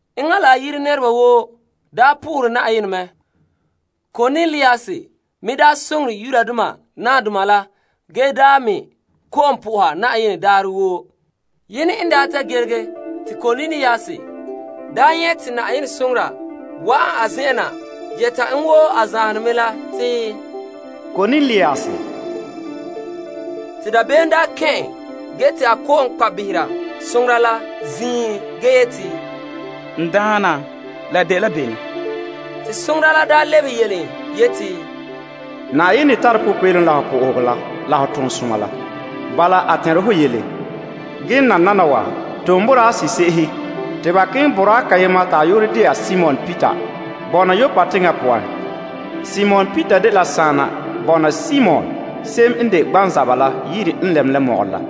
Enŋa la a yire nɛreba woo dole Yenɛ te a me soŋore nahadoma la ge me kɔ'ɔn soha Yenɛ daarɛ woo. Yene n ta gelege te Kornelius daa wa nyɛ' te Yenɛ soŋora wa'ana a zen'an na yɛta en wo a zanhe ne mɛ la te, Kornelius. Te dabeem kɛn' en ge te a kɔ'ɔn kpa' behera soŋora la ziin ge yeti, N Daana, la dela bene? Te soŋora la lebehe en yeti, Yenɛ tare popeelom la ho sohoga la ho toonsoma la. Bala a tɛnre ho yele, ge nananawa tom boraa se'ehe te ba keŋɛ boraa kayema ta a yu'urɛ de'a Simon Peter bɔna Yoppa teŋa poan. Simon Peter la dela saana bɔna Simon se'em n de gbanzaba la yire n lɛm mɔgɔrɛ la.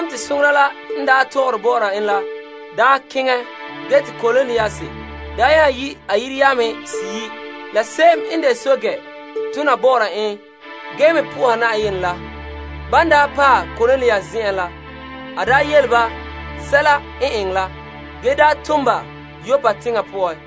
Soŋora la n tɔgɔre bɔ'ɔra en la keŋɛ, bilam te Kornelius nya yi' a yire yamehe seyi' la se'em n de pɛɛntɛɛnra tona bɔ'ɔra en ge me po'oha Yenɛ la. Ban daa paɛ Kornelius zen'en la, a yele ba sɛla n eŋɛ la, ge tom ba Yoppa teŋa poan.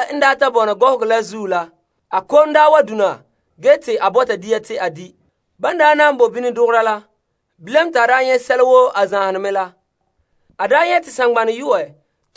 En ta bɔna gɔhɔgɔ la zuo la, a kom wa dona ge te a bɔta dia te a di'. Ban boe bini dɔgɔra la, bilam te a daa nyɛ' liligere. A nyɛ' te saŋgbanɛ yu'ɛ sigera na wo nɛreba n gorɛ dɛ bahera na la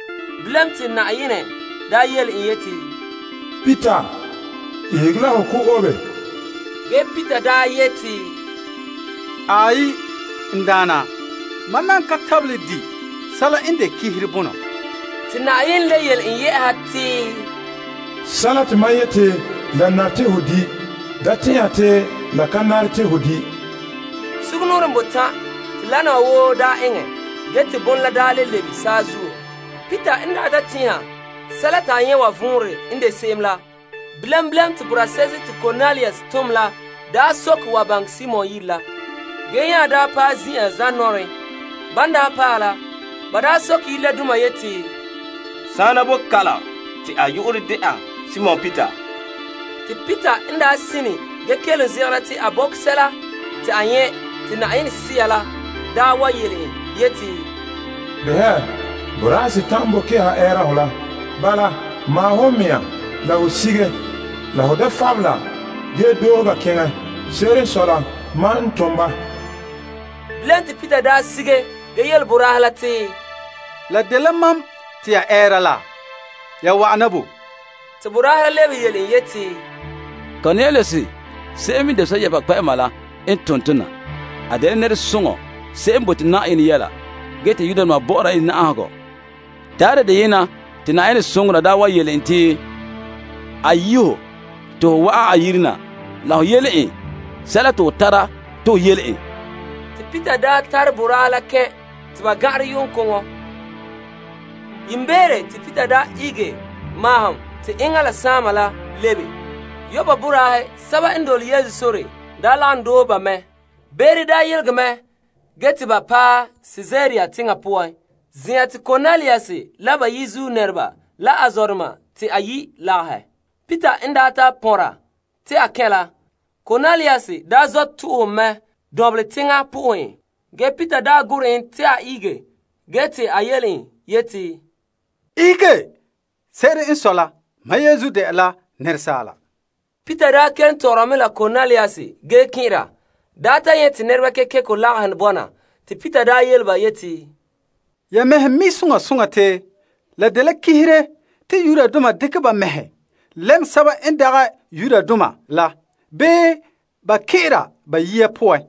Bilam te Yenɛ yele en yeti, Peter, ihege la ho ko' obe. Ge Peter yeti, Aai, n Daana, mam nan ka tabelɛ di' sɛla n de ganleŋɔ bonɔ. Te Yenɛ le yele en te, Sɛla te mam yete la nare te ho di' da tɛn'ɛha te la ka nare te ho di'. Sugumnɔɔren botan' te wana wa woo eŋɛ ge te bon la le lebe saazuo. Peter n ta tɛn'ɛha sɛla te a nyɛ' wa vɔnrɛ n de se'em la, bilam bilam te boraa se'ehe te Kornelius n daa tom la n soke wa baŋɛ Simon yire la, ge nya paɛ ze'a la zanɔɔren. Ban daa paɛ la, ba soke yire la doma yeti, Saana boe kalam te a yu'urɛ de'a Simon Peter? Te Peter n sine ge kelom zegera te a bɔkɛ sɛla te a nyɛ' te Yenɛ Sea yele en yeti, Behɛ, boraahe setan' n boe kɛha ɛɛra hɔ la. Bala maahom ho mea la ho sige la ho da fabela ge doohe ba keŋɛ. Se'ere n sɔe la, mam n tom ba. Bilam te Peter sige ge yele boraahe la te, La dela mam te ya ɛɛra la. Ya wa'ana bo? Te boraahe la lebehe yele en yeti, Kornelius se'em n de pɛɛntɛɛnreba kpɛ'ɛma la n tom tɔ na. A dela nɛresoŋɔ se'em n bote Yenɛ yɛla ge te Yudoma bɔ'ɔra en na'ahegɔ. Daarɛ deyena te Na'ayenɛ soŋora daa wa yele en te a yi' ho te ho wa'an a yire na la ho yele en sɛla te ho tara te ho yele en. Te Peter tare boraahe la kɛn' te ba gan'anrɛ yu'uŋkoŋɔ. Yiimbeere te Peter ihege maahom te enŋa la saama la lebe. Yoppa boraahe sɛba n dole Yesu sore lagom doohe ba mɛ. Beere daa yelegɛ mɛ ge te ba paɛ Kaesarea teŋa poan, zen'an te Kornelius la ba yizuo nɛreba la a zɔdoma te a yi' lagahɛ. Peter n daa ta pɔnra te a kɛn' la, Kornelius zɔ' to'ohɛ en mɛ dɔnbelɛ teŋa po'ohɛ en. Ge Peter gorɛ en te a ihege ge te a yele en yeti, Ihege. Se'ere n sɔe la, ma yeenzuo de'a la asaala. Peter kelom tɔgɔra mɛ la Kornelius ge kɛn'ɛra ta nyɛ' te nɛreba kekeko lagahɛ bɔna. Te Peter yele ba yeti, Ya mɛhe mi' soŋa soŋa te la dela ganleŋɔ te Yudoma dekɛ ba mɛhe lɛm sɛba n dagɛ Yudoma la bii ba kɛn'ɛra ba yiya poan.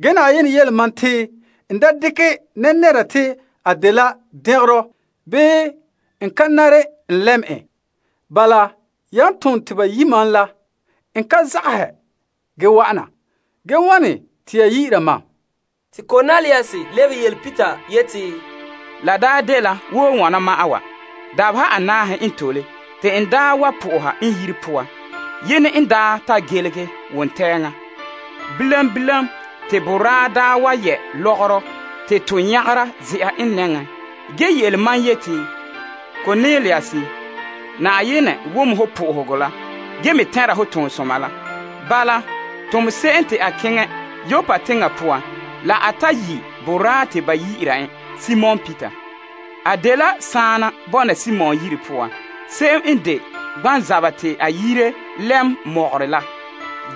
Ge Yenɛ yele mam te n da dekɛ nɛra te a dela dɛngerɔ bii a ka nare n lɛm en. Bala yan tom te ba yi' ma la, n ka zagahɛ ge wa'ana. Ge wane te ya yi'ira mam? Te Kornelius lebehe yele Peter yeti, La daa dela wo wana ma'an wa, dabeha anaahe n tole te n daa wa soha n yire poan yenɛ n daa ta gelehe wontɛŋa. Bilam bilam te boraa daa wa yɛ lɔgɔrɔ te to nyagera ze'a n nɛŋa ge yele mam yeti, Kornelius, Yenɛ wom ho sohoga la ge me tɛnra ho toonsoma la. Bala, tom se'em te a keŋɛ Yoppa teŋa poan la a ta yi' boraa te ba yi'ira en Simon Peter. A dela saana bɔna Simon yire poan, se'em n de gbanzaba te a yire lɛm mɔgɔrɛ la.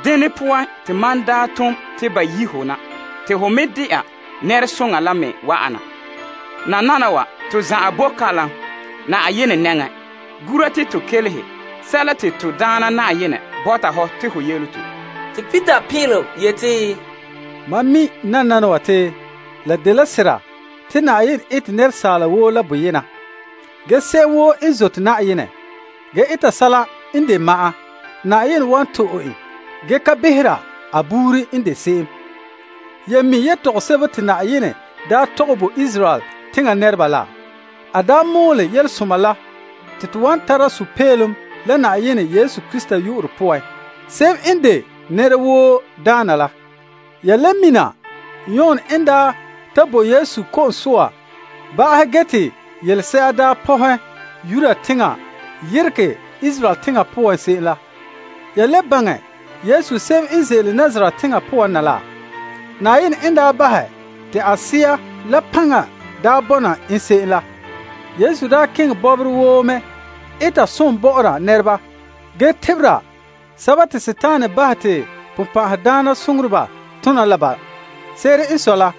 Dene poan, te mam daa tom te ba yi' ho na te ho me de'a nɛresoŋa la me wa'ana. Nananawa to zan'an bo kalam Yenɛ nɛŋa, gura te to kelehe sɛla ta to Daana Na'ayenɛ bɔta ho te ho yele tɔ. Te Peter pin'ilom yeti, Mam mi' nananawa te la dela sera te Yenɛ ete nɛra woo la boyena. Ge se'em woo n zote Yenɛ ge eta sɛla n de ma'an, Yenɛ wan to'e en ge ka behera a buuri n de se'em. Ya mi' yetɔgom sebo te Yenɛ daa tɔgɛ bo Israel teŋa nɛreba la. A daa mɔɔlɛ Yelesoma la te to wan tara sunma'ahom la Yesu Krista yu'urɛ poan, se'em n de nɛra woo Daana la. Ya le mina Yon n daa ta bo Yesu ko'om soa ba'ahɛ ge te yelese'a daa pɔhɛ Galilee teŋa yeregɛ Yudea teŋa poan se'em la. Ya le baŋɛ Yesu se'em n ze'ele Nazaret teŋa poan na la. Yenɛ n daa bahɛ te a Sea la paŋa daa bɔna en se'em la. Yesu daa keŋɛ bɔbɔrɛ woo mɛ eta som bɔ'ɔra nɛreba ge tebera sɛba te Sagona bahɛ te bonbɛ'ɛhe tona la ba. Se'ere n sɔe la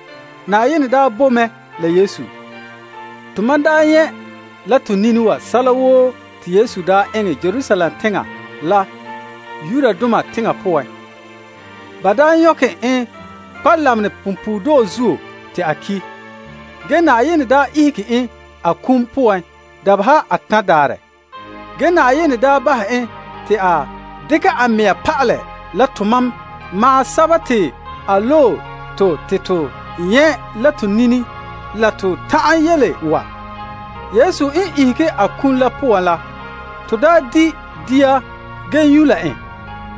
Yenɛ daa boe mɛ la Yesu. Tomam daa nyɛ' la to nini wa sɛla woo te Yesu daa eŋɛ Yudoma teŋa poan la Yerusalem. Ba daa nyɔkɛ en kpa' lamenɛ punpuuredɔɔ zuo te a ki'. Ge Yenɛ daa ihege en a kum poan dabeha atan' daarɛ. Ge Yenɛ daa bahɛ en te a dekɛ a mea pa'alɛ la tomam ma'an sɛba te a loe to te to nyɛ' la to nini la to ta'an yele wa. Yesu n ihege a kum la poan la, to daa di' dia ge nyu' la en.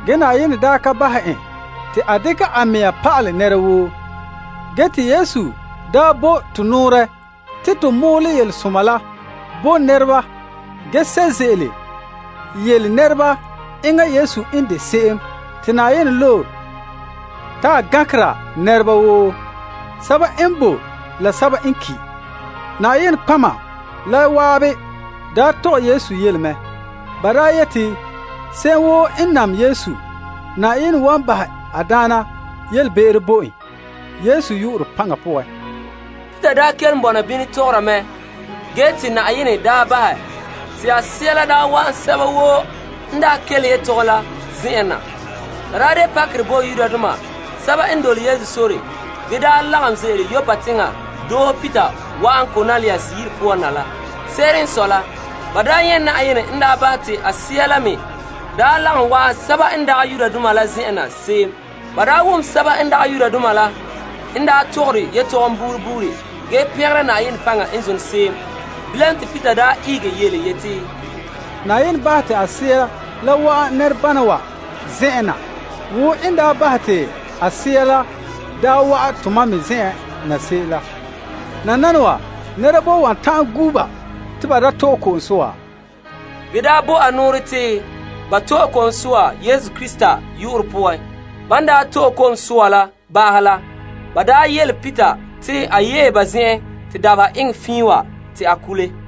Ge Yenɛ daa ka bahɛ en te a dekɛ a mea pa'alɛ nɛra woo. Ge te Yesu daa bo to nɔɔrɛ te to mɔɔlɛ yelesoma la bo nɛreba ge sɛ' ze'ele yele nɛreba enŋa Yesu n de se'em te Yenɛ loe ta a gankera nɛreba woo, sɛba n boe la sɛba n ki'. Nɔtɔgɔheba la zan'an daa tɔgɛ Yesu yele mɛ. Ba daa yete se'em woo n nam Yesu, Yenɛ wan bahɛ a daana yelebe'ero bo en Yesu yu'urɛ paŋa poan. Peter n daa kelom bɔna bini tɔgɔra mɛ ge te Yenɛ bahɛ te a Sea la wa'an sɛba woo n kelehe yetɔgom la zen'an na. La de pakerɛ bo Yudoma sɛba n dole Yesu sore ge lagom ze'ele Yoppa teŋa doohe Peter wa'an Kornelius yire poan na la. Se'ere n sɔe la ba nyɛ' Yenɛ n bahɛ te a Sea la me lagom wa'an sɛba n dagɛ Yudoma la zen'an na se'em. Ba wom sɛba n dagɛ Yudoma la n tɔgɔre yetɔgom bo buuri buuri ge pɛngere Yenɛ paŋa n zone se'em. Bilam te Peter ihege yeti, Yenɛ bahɛ te a Sea la wa'an nɛrebana wa zen'en na wo n daa bahɛ te a Sea la daa wa'an tomam me zen'en na se'em la. Nananawa nɛra boe wan ta'an gu' ba te ba da to'e ko'om soa? Ge te a bo a nɔɔrɛ te ba to'e ko'om soa Yesu Krista yu'urɛ poan. Ba nya yele Peter te a yee ba zen'en te dabeha eŋɛ fiin wa, te a kule.